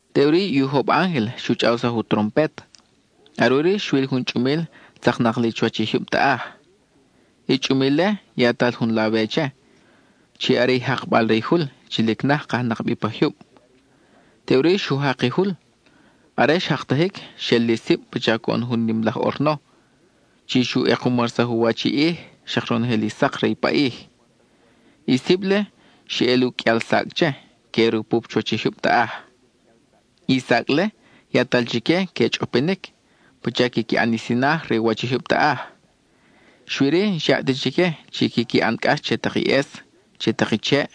Teʼuri i ujob ángel xu chʼawsaj u trompet. Are ʼuri xwil jun chʼumil tzaknak li chuwach i jyub taʼaj. I chʼumil-le, yatal jun lawe che, chi are i jakbal re i jul chi lic naj kajnak bi pa jyub. Teʼuri, xu jak i jul; are xjaktajic, xel li sib pacha coʼon jun nim laj ʼorno, chi xu ʼekumarsaj u wach i ʼij, xak ronojel i sak re i paʼij. I sib-le, xe ʼel u qʼuial sacʼ che, que rupup chuwach i jyub taʼaj. I sacʼ-le, yatal chique que chʼopinic pacha quiqui ʼan i sinaj re u wach i jyub taʼaj. Xui-ri, n-xyaʼ ta chique chi quiqui ʼan cʼax che tak i ʼes, che tak i cheʼ,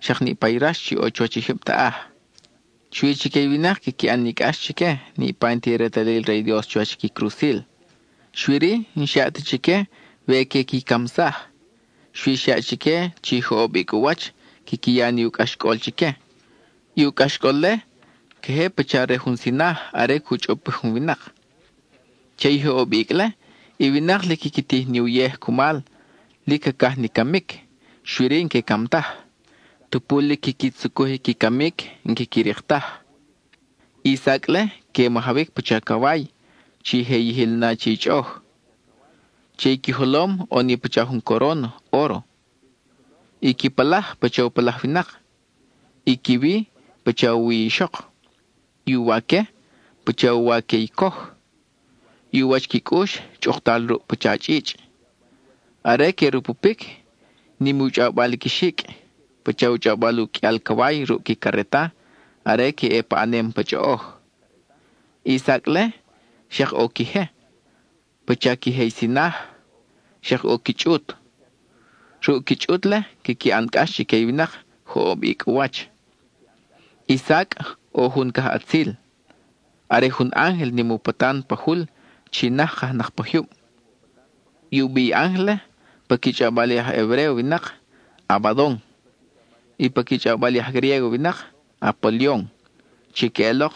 xak niʼpa i rax chi ʼo chuwach i jyub taʼaj. Xui chique i winak quiqui ʼan ni cʼax chique, niʼpa i n-ti retalil re i Dios chuwach qui crusil. Xui-ri, n-xyaʼ ta chique we que qui camsaj. Xui xyaʼ chique chi joʼob icʼ u wach quiqui ya ni u cʼaxcʼol chique. I u cʼaxcʼol-le, queje pacha re jun sinaj are cu chʼopij jun winak. Che i joʼob icʼ-le, i winak lic quiqui tij ni uyej cumal, lic cacaj ni camic, xui-ri, n-que cam taj. Tupu lic quiqui tzucuj qui camic, n-quiqui rik taj. I sacʼ-le que majawic pacha caway chi je yijil na che i chʼoʼoj. Che i qui jolom ʼo ni pacha jun coron óro. I qui palaj, pacha u palaj winak. I qui wi, pacha u wi ixok; i u waque, pacha u waque i coj. I u wach qui cʼux, chʼuktal ruʼ pacha chʼichʼ. Are que rupupic, nim u chʼawbal i qui xicʼ, pacha u chʼawbal u qʼuial caway ruʼ qui careta are que ʼe paʼanem pa chʼoʼoj. I sacʼ-le, xak ʼo qui je, pacha qui je i sinaj, xak ʼo qui chʼut. Ruʼ qui chʼut-le, quiqui ʼan cʼax chique i winak joʼob icʼ u wach. I sacʼ, ʼo jun cajʼatzil; are jun ángel nim u patan pa jul chi naj kajnak pa jyub. I u bi i ángel-le pa qui chʼawbal i aj Hebréo winak: Abadon, y pa qui chʼawbal i aj Griégo winak: Apolion, chi queʼelok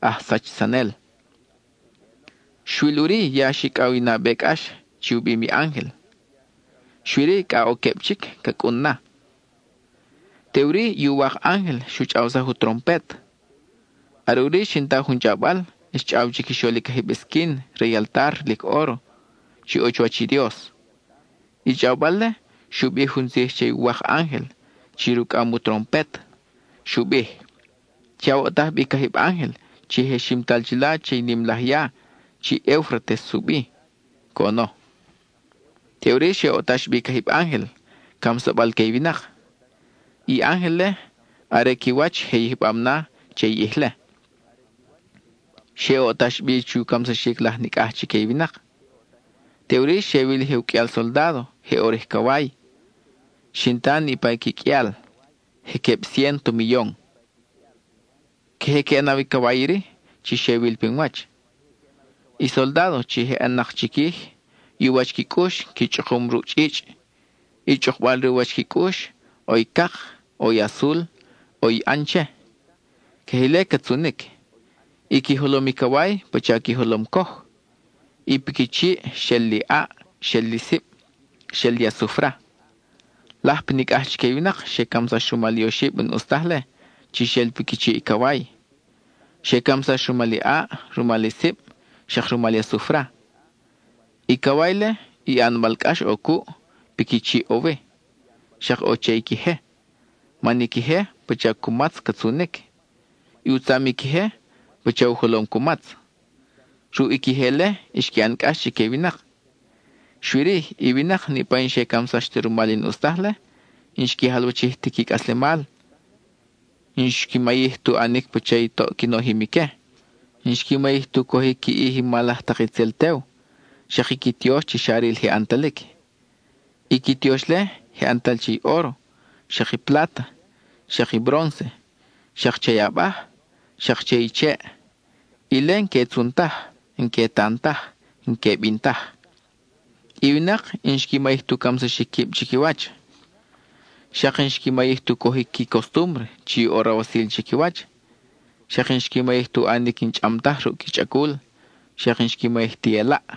“aj sachsanel”. Xwil ʼuri, ya xicʼaw i nabe cʼax chi u bim i ángel, xui-ri cʼa ʼo queb chic ca cʼun na. Teʼuri i uwak ángel xu chʼawsaj u trompet; are ʼuri xin ta jun chʼawbal, xchʼaw chiquixol i cajib esquin re i altar lic óro, chi ʼo chuwach i Dios. I chʼawbal-le xu bij jun tzij che i uwak ángel chi rucʼam u trompet; xu bij: —Che awoʼtaj bi i cajib ángel chi je ximtal chila che i nim laj ya chi Eufrates u bi —coʼono. Teʼuri xe oʼtax bi i cajib ángel, camsabal que i winak. I ángel-le, are qui wach je yijbam na che i ʼij-le. Xe oʼtax bi chu camsaxic laj nicʼaj chique i winak. (Teʼuri xe wil je u qʼuial soldádo, je ʼo rij caway.) Xin ta niʼpa i qui qʼuial: je queb ciénto miyon. Queje que ʼanaw i caway iri, chi xe wil pin wach; i soldádo, chi je ʼan-nak chiquij, i u wach qui cʼux, qui chʼukum ruʼ chʼichʼ. I chʼukbal re u wach qui cʼux, ʼo i cak, ʼo i azul, ʼo i ʼan che, queje ile ca tzunic. I qui jolom i caway pacha qui jolom coj; i piqui chiʼ, xel li ʼaʼ, xel li sib, xel li asufra. Laj pa nicʼaj chique i winak xe camsax rumal i oxib n-ʼus taj-le, chi xel piqui chiʼ i caway. Xe camsax rumal i ʼaʼ, rumal i sib, xak rumal i asufra. I caway-le, i ʼanbal cʼax ʼo cuʼ, piqui chiʼ ʼo wi, xak ʼo che i qui je, man i qui je, pacha cumatz ca tzunic; i u tzam i qui je, pacha u jolom cumatz. Ruʼ i qui je-le, xqui ʼan cʼax chique i winak. Xui-ri, i winak, niʼpa i n-xe camsax ta rumal i n-ʼus taj-le, n-xqui jalwachij ti qui cʼaslemal. N-xqui mayij tu ʼanic pacha i toʼ qui nojim ique. N-xqui mayij tu cojic qui ʼij i mal laj tak itzel tew, xak i qui tiox chi xa ril je ʼantalic. I qui tiox-le, je ʼantal che i óro, xak i pláta, xak i brónce, xak che i abaj, xak che i cheʼ; ile n-que tzun taj, n-que tan taj, n-que bin taj. I winak xak n-xqui mayij tu camsaxic quib chiquiwach; xak n-xqui mayij tu cojic qui costúmbre chi ʼo rawasil chiquiwach, xak n-xqui mayij tu ʼanic i n-chʼam taj ruʼ qui chʼacul, xak n-xqui mayij ti elaʼ.